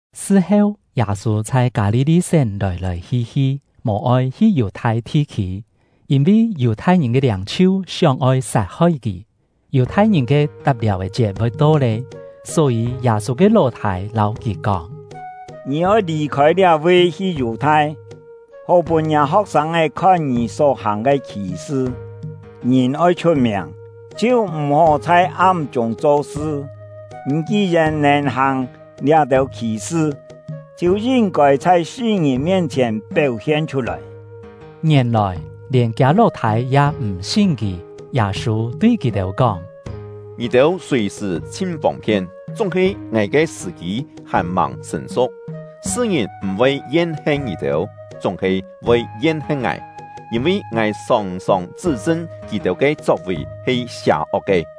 Sṳ-heu, Yâ-sû chhai Kâ-li-li-sén lòi-lòi hi-hi, mò-oi hi Yù-thai thi-khî, yîn-vi Yù-thai-ngìn ke liâng-chhiu sióng-oi sat-hoi kì. Yù-thai-ngìn ke Tap Liàu-è Chiet voi to lé, só-yî Yâ-sû ke ló-thâi lâu kì kóng: “Ngì oi lì-khôi liá-vi, hi Yù-thai, hó pûn ngiâ ho̍k-sâng khon ngì só hàng ke khì-sṳ. Ngìn oi chhut-miàng, chhiu m̀-hó chhai am-chûng cho-sṳ. Ngì ki-yèn nèn hàng liá-têu khì-sṳ, chhiu yin-kôi chhai sṳ-ngìn mien-chhièn péu-hien chhut-lòi!” (Ngièn-lòi lièn kiâ ló-thâi ya mò sin kì.) Yâ-sû tui kì-têu kóng: “Ngì-têu sùi-sṳ̀ chhin fông-phien; chúng-he ngài ke sṳ̀-kî hàn-màng sṳ̀n-su̍k. Sṳ-ngìn m̀-voi yen-hen ngì-têu, chúng-he voi yen-hen ngài, yîn-vi ngài sòng-sòng chṳ́-chṳn kì-têu ke chok-vì he sià-ok ke.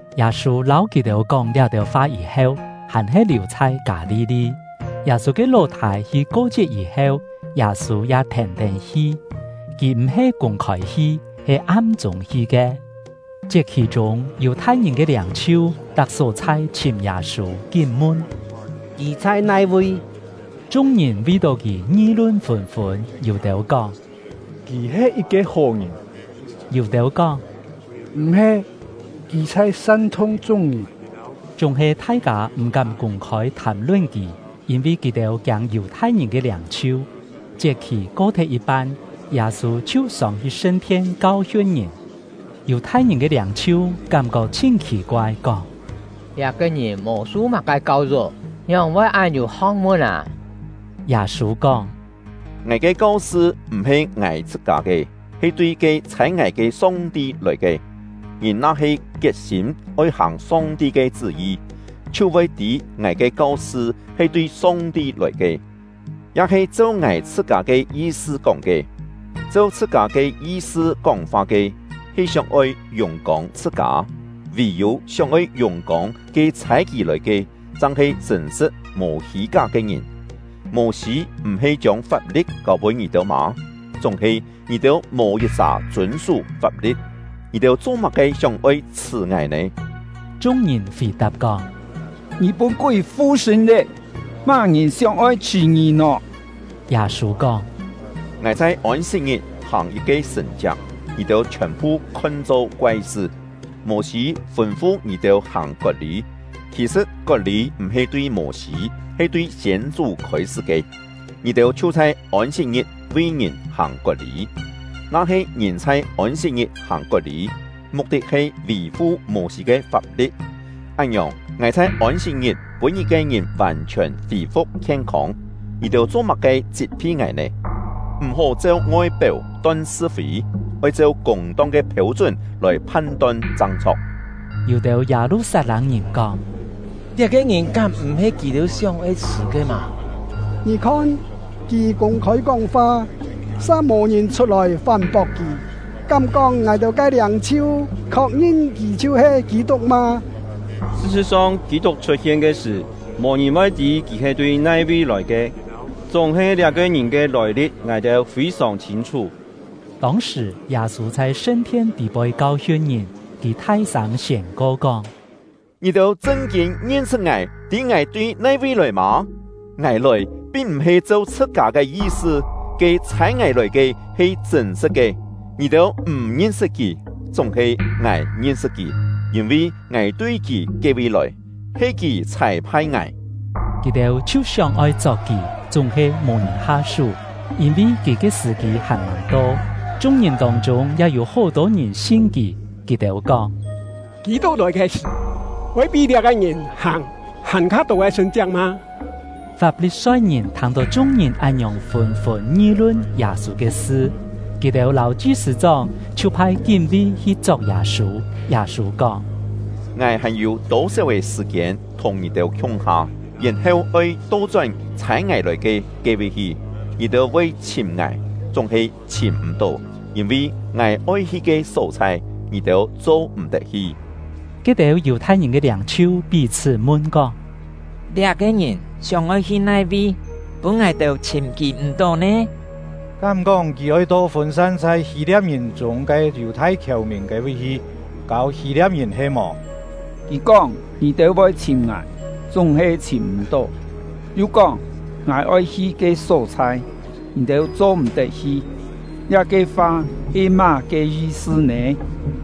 Yâ-sû lâu kì-têu kóng liá-têu fa yî-heu, hàn-he liù chhai Kâ-li-li. Yâ-sû ke ló-thâi hi ko-chiet yî-heu, Yâ-sû ya thèn-tén hi. Kì m̀-he kûng-khôi hi, he am-chûng hi ke. Chiet-khì-chûng, Yù-thai-ngìn ke liâng-chhiu tak só-chhai chhìm Yâ-sû, kín mun: “Kì chhai nai-vi?” Chung-ngìn vi-tó kì ngi-lun fûn-fûn; yû-têu kóng: “Kì he yit-ke hó ngìn!” yû-têu kóng: “M̀-he! Kì chhai san-thung chung-ngìn.” Chúng-he thai-kâ m̀-kám kûng-khôi thàm-lun kì, yîn-vi kì-têu kiâng Yù-thai-ngìn ke liâng-chhiu. Chiet-khì ko-thet yit-pan, Yâ-sû chhiu sông-hi sṳn-thien kau-hiun ngìn. Yù-thai-ngìn ke liâng-chhiu kám-kok chhin khì-koai, kóng: “Liá-ke ngìn mò su má-ke kau-yuk, ngióng-voi án yû ho̍k-mun â?” Yâ-sû kóng: “Ngài ke kau-sṳ m̀-he ngài chhṳ-kâ ke, he tui ke chhâi ngài ke Song-ti lòi ke. Ngìn na-he kiet-sîm oi hàng Song-ti ke chṳ́-yi, chhiu voi tî ngài ke kau-sṳ he tui Song-ti lòi ke, ya-he cheu ngài chhṳ-kâ ke yi-sṳ kóng ke. Cheu chhṳ-kâ ke yi-sṳ kóng-fa ke, he sióng-oi yùng-kông chhṳ-kâ; vì-yû sióng-oi yùng-kông ke chhâi kì lòi ke, chang-he chṳ̂n-sṳ̍t mò hî-ká ke ngìn. Mô-sî m̀-he chiông fap-li̍t kâu-pûn ngì-têu mâ? Chúng-he ngì-têu mò yit-sà chûn-sú fap-li̍t. Ngì-têu cho-má-ke sióng-oi chhṳ̀ ngài nè?” Chung-ngìn fì-tap kóng: “Ngì pûn kúi fu-sṳ̂n lé! Má-ngìn sióng-oi chhṳ̀ ngì nò?” Yâ-sû kóng: “Ngài chhai Ôn-sit-ngit hàng yit-ke sṳ̀n-chiak, ngì-têu chhiòn-phu khon-cho koai-sṳ. Mô-sî fûn-fu ngì-têu hàng kot-lî (khì-sṳ̍t kot-lî m̀-he tui Mô-sî, he tui siên-chú khôi-sṳ́ ke), ngì-têu chhiu chhai Ôn-sit-ngit vi ngìn hàng kot-lî. Na-he ngìn chhai Ôn-sit-ngit hàng kot-lî, muk-tit he vì-fu Mô-sî ke fap-li̍t, án-ngiòng, ngài chhai Ôn-sit-ngit pûn yit-ke ngìn vàn-chhiòn fî-fu̍k khien-không, ngì-têu cho-má-ke chit-phi ngài nè? M̀-hó cheu ngoi-péu ton sṳ-fî, oi cheu kûng-tong ke phêu-chún lòi phan-ton chang chho̍k.” Yû-têu Yâ-lu-sat-lâng-ngìn kóng: “Liá-ke ngìn kám m̀-he kì-têu sióng-oi chhṳ̀ ke mâ? Ngì khon, kì kûng-khôi kóng-fa, sa mò ngìn chhut-lòi fán-pok kì! Kám-kóng ngài-têu ke liâng-chhiu khok-ngin kì chhiu-he Kî-tuk mâ? Sṳ-sṳ̍t-song, Kî-tuk chhut-hien ke sṳ̀, mò-ngìn voi tî kì he tui nai-vi lòi ke, chúng-he liá-ke ngìn ke lòi-li̍t ngài-têu fî-sòng chhîn-chhú.” Tông-sṳ̀, Yâ-sû chhai sṳn-thien tî-poi kau-hiun ngìn, kì thai-sâng siên-ko kóng: “Ngì-têu chṳn-kîn ngin-sṳt ngài, tî ngài tui nai-vi lòi mâ? Ngài lòi, pin m̀-he cheu chhṳ-kâ ke yi-sṳ. Ke ‘Chhâi ngài lòi ke’ he chṳ̂n-sṳ̍t ke. Ngì-têu m̀ ngin-sṳt Kì, chúng-he ngài ngin-sṳt Kì; yîn-vi ngài tui Kì ke-vi lòi, he Kì chhâi-phai ngài.” Kì-têu chhiu sióng-oi chok kì, chúng-he mò ngìn ha-sú, yîn-vi kì ke sṳ̀-kî hàn-màng to. Chung-ngìn tông-chûng ya yû hó-tô ngìn sin kì; kì-têu kóng: “Kî-tuk lòi ke sṳ̀, voi pí liá-ke ngìn hàng hàn-kha tô ke sṳ̀n-chiak mâ?” Fap-li-soi-ngìn thâng-tó chung-ngìn án-ngiòng fûn-fûn ngi-lun Yâ-sû ke sṳ, kì-têu lâu chi-sṳ̂-chóng chhiu phai kín-ví hi chok Yâ-sû. Yâ-sû kóng: “Ngài hàn-yû tô-séu-è sṳ̀-kiên thùng ngì-têu khiung-ha, yèn-heu oi to-chón ‘Chhâi ngài lòi ke’ ke-vi hi. Ngì-têu voi chhìm ngài, chúng-he chhìm m̀-tó; yîn-vi ngài oi hi ke só-chhai, ngì-têu cho-m̀-tet hi.” Ke-têu Yù-thai-ngìn ke liâng-chhiu pí-chhṳ́ mun-kóng: “Liá-ke ngìn sióng-oi hi nai-vi, pûn ngài-têu chhìm kì m̀-tó nè? Kám-kóng kì oi to fûn-san chhai Hî-lia̍p-ngìn chûng ke Yù-thai khièu-mìn ke-vi hi, kâu Hî-lia̍p-ngìn he-mò? Kì kóng ‘Ngì-têu voi chhìm ngài, chúng-he chhìm m̀-tó’ yu kóng ‘Ngài oi hi ke só-chhai, ngì-têu cho-m̀-tet hi’, liá-ke fa he má-ke yi-sṳ nè?”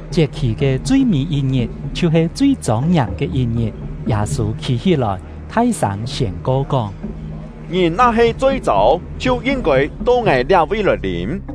Chiet-khì ke chui-mî yit-ngit, chhiu-he chui chông-ngiàm ke yit-ngit, Yâ-sû khî-hí-lòi, thai-sâng siên-ko kóng: “Ngìn na-he choi-châu, chhiu yin-kôi to ngài liá-vi lòi lîm.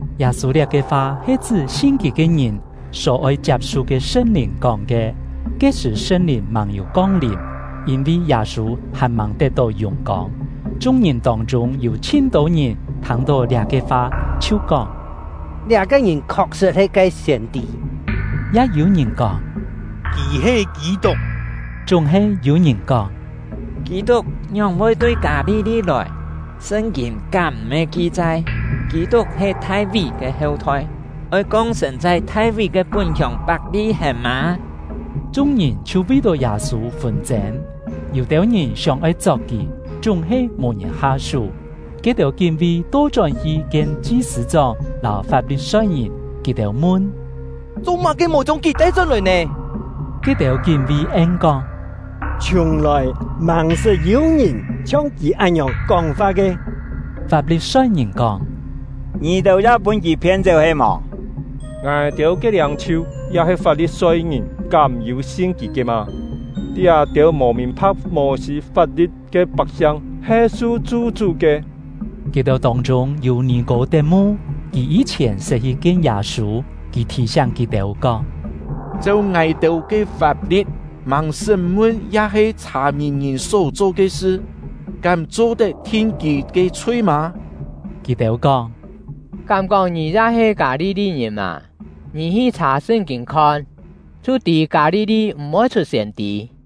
Yâ-sû liá-ke fa he chṳ́ sin kì ke ngìn só oi chiap-su ke Sṳn-Lìn kóng ke. Ke-sṳ̀ Sṳn-Lìn màng-yû kong-lìm, yîn-vi Yâ-sû hàn-màng tet-tó yùng-kông. Chung-ngìn tông-chûng yû chhin-tô ngìn thâng-tó liá-ke fa, chhiu kóng: “Liá-ke ngìn khok-sṳ̍t he ke siên-tî!” Ya yû-ngìn kóng: “Kì he Kî-tuk!” Chúng-he yû-ngìn kóng: “Kî-tuk ngióng-voi tui Kâ-li-li lòi? Sṳn-kîn kám m̀-he ki-chai, Kî-tuk he Thai-ví ke heu-thoi, oi kong-sên chhai Thai-ví ke pún-hiông Pak-li-hèn mâ?” Chung-ngìn chhiu vi-tó Yâ-sû fûn-chên. Yû-têu ngìn sióng-oi chok kì, chúng-he mò ngìn ha-sú. Ke-têu kín-ví to-chón-hi kien chi-sṳ̂-chóng lâu Fap-li-soi-ngìn; kì-têu mun: “Cho-má-ke mò chiông kì tai-chón-lòi nè?” Ke-têu kín-ví en-kóng: “Chhiùng-lòi màng-sṳt yû-ngìn chhiong kì án-ngiòng kóng-fa ke!” Fap-li-soi-ngìn kóng: “Ngì-têu ya pûn kì phien-chéu he-mò? Ngài-têu ke liâng-chhiu ya-he Fap-li-soi-ngìn kám yû sin kì ke mâ? Liá-têu mò mìn-pha̍k Mô-sî fap-li̍t ke pak-siang he su chu-chú ke!” Kì-têu tông-chûng yû Nì-kô-tet-mu, kì yî-chhièn sṳt hi kien Yâ-sû. Kì thì-siáng kì-têu, kóng: “Cheu ngài-têu ke fap-li̍t, màng sṳ́m-mun ya-he chhà-mìn ngìn só-cho ke sṳ, kám cho-tet thin kì ke chhui mâ?” Kì-têu kóng: “Kám-kóng ngì ya he Kâ-li-li-ngìn mâ? Ngì hi chhà Sṳn-kîn khon, chhiu tî Kâ-li-li m̀-voi chhut siên-tî.”